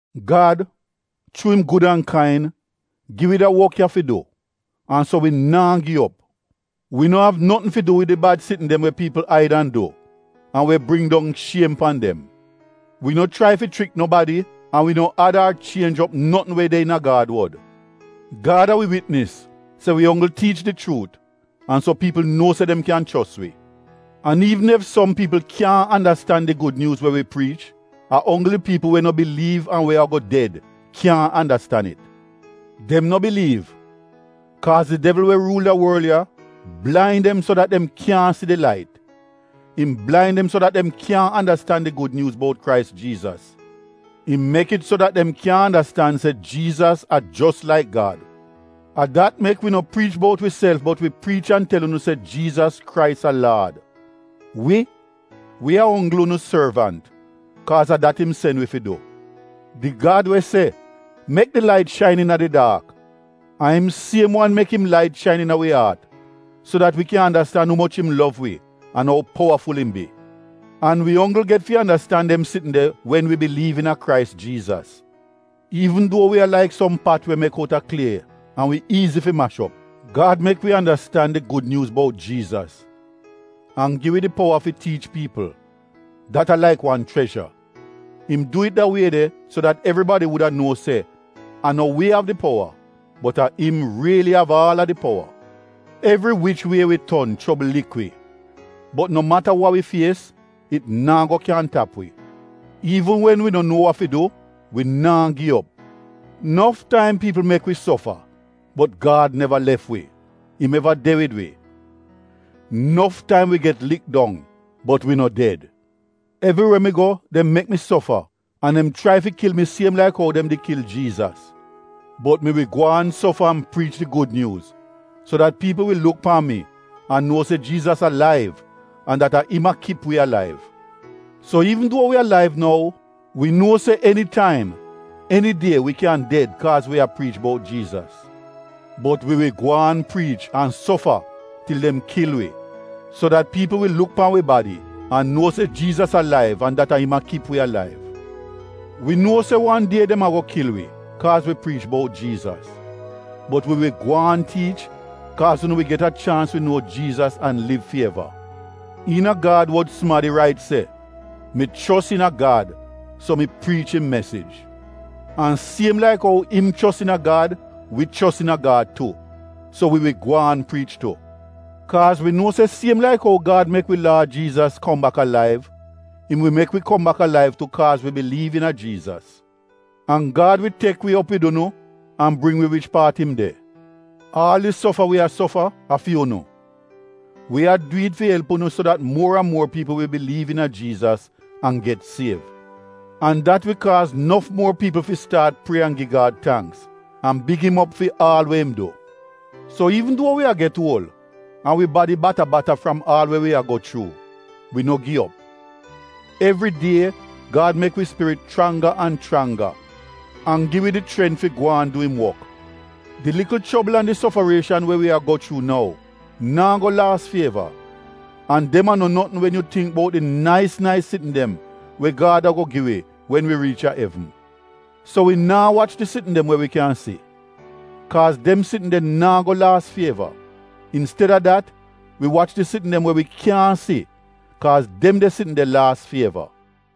Gad, chuu im gud an kain, gi wi da wok ya fi du, an so wi naa gi op. Wi no av notn fi du wi di bad sitn dem we piipl aid an du an we bring dong shiem pan dem. Wi no chrai fi chrik nobadi an wi no ad ar chienj op notn we de iina Gad wod. Gad a wi witnis se wi onggl tiich di chuut an so piipl nuo se dem kyan chos wi. An iivn ef som piipl kyaahn andastan di Gud Nyuuz we wi priich, a onggl di piipl we no biliiv an we ago ded, kyaahn andastan it. Dem no biliiv kaaz di devl, we ruul da worl ya, blain dem so dat dem kyaahn si di lait. Im blain dem so dat dem kyaahn andastan di Gud Nyuuz bout Krais Jiizas. Im mek it so dat dem kyaahn andastan se Jiizas a jos laik Gad. A dat mek, wi no priich bout wiself bot wi priich an tel unu se Jiizas Krais a Laad. Wi, wi a onggl unu sorvant, kaaz a dat im sen wi fi du. Di Gad we se, “Mek di lait shain iina di daak,” a im siem wan mek im lait shain iina wi aat so dat wi kyan andastan umoch im lov wi an ou powaful im bi. An wi onggl get fi andastan dem sitn de wen wi biliiv iina Krais Jiizas. Iivn duo wi a laik som pat we mek outa klie an we iizi fi mash op, Gad mek wi andastan di Gud Nyuuz bout Jiizas an gi wi di powa fi tiich piipl, dat a laik wan chrezha. Im du it da wie de so dat evribadi wuda nuo se a no wi av di powa, bot a im riili av aal a di powa. Evri wich wie wi ton chobl lik wi bot no mata wa wi fies, it naa go kyan tap wi. Iivn wen wi no nuo wa fi du, wi naa gi op. Nof taim piipl mek wi sofa bot Gad neva lef wi, im eva de wid wi. Nof taim wi get lik dong, bot wi no ded. Evriwe mi go dem mek mi sofa an dem chrai fi kil mi siem laik ou dem di kil Jiizas. Bot mi wi gwaan sofa an priich di Gud Nyuuz so dat piipl wi luk pan mi an nuo se Jiizas alaiv an dat a im a kip wi alaiv. So iivn duo wi alaiv nou, wi nuo se enitaim, enidie wi kyan ded kaaz wi a priich bout Jiizas. Bot wi wi gwaan priich an sofa til dem kil wi so dat piipl wi luk pan wi badi an nuo se Jiizas alaiv an dat a im a kip wi alaiv. Wi nuo se wan die dem ago kil wi kaaz wi priich bout Jiizas, bot wi wi gwaan tiich kaaz unu wi get a chaans fi nuo Jiizas an liv fi eva. Iina Gad wod sumadi rait se, “Mi chos iina Gad so mi priich im mesij.” An siem laik ou im chos iina Gad, wi chos iina Gad tu, so wi wi gwaan priich tu. Kaaz wi nuo se siem laik ou Gad mek wi Laad Jiizas kom bak alaiv, im wi mek wi kom bak alaiv tu kaaz wi biliiv iina Jiizas. An Gad wi tek wi op wid unu an bring wi wich paat im de. Aal di sofa wi a sofa, a fi unu. Wi a du it fi elp unu so dat muor an muor piipl wi biliiv iina Jiizas an get siev. An dat wi kaaz nof muor piipl fi staat prie an gi Gad tangks an big im op fi aal we im du. So iivn duo wi a get uol an wi badi bata-bata fram aal we wi a go chuu, wi no gi op. Evri die Gad mek wi spirit chrangga an chrangga an gi wi di chrent fi gwaan du im wok. Di likl chobl an di sofarieshan we wi a go chuu nou, naa go laas fi eva an dem a no notn wen yu tingk bout di nais nais sitn dem we Gad ago gi wi, wen wi riich a evn. So wi naa wach di sitn dem we wi kyan si, kaaz dem sitn de naa go laas fi eva. Insteda dat wi wach di sitn dem we wi kyaahn si kaaz dem de sitn de laas fi eva.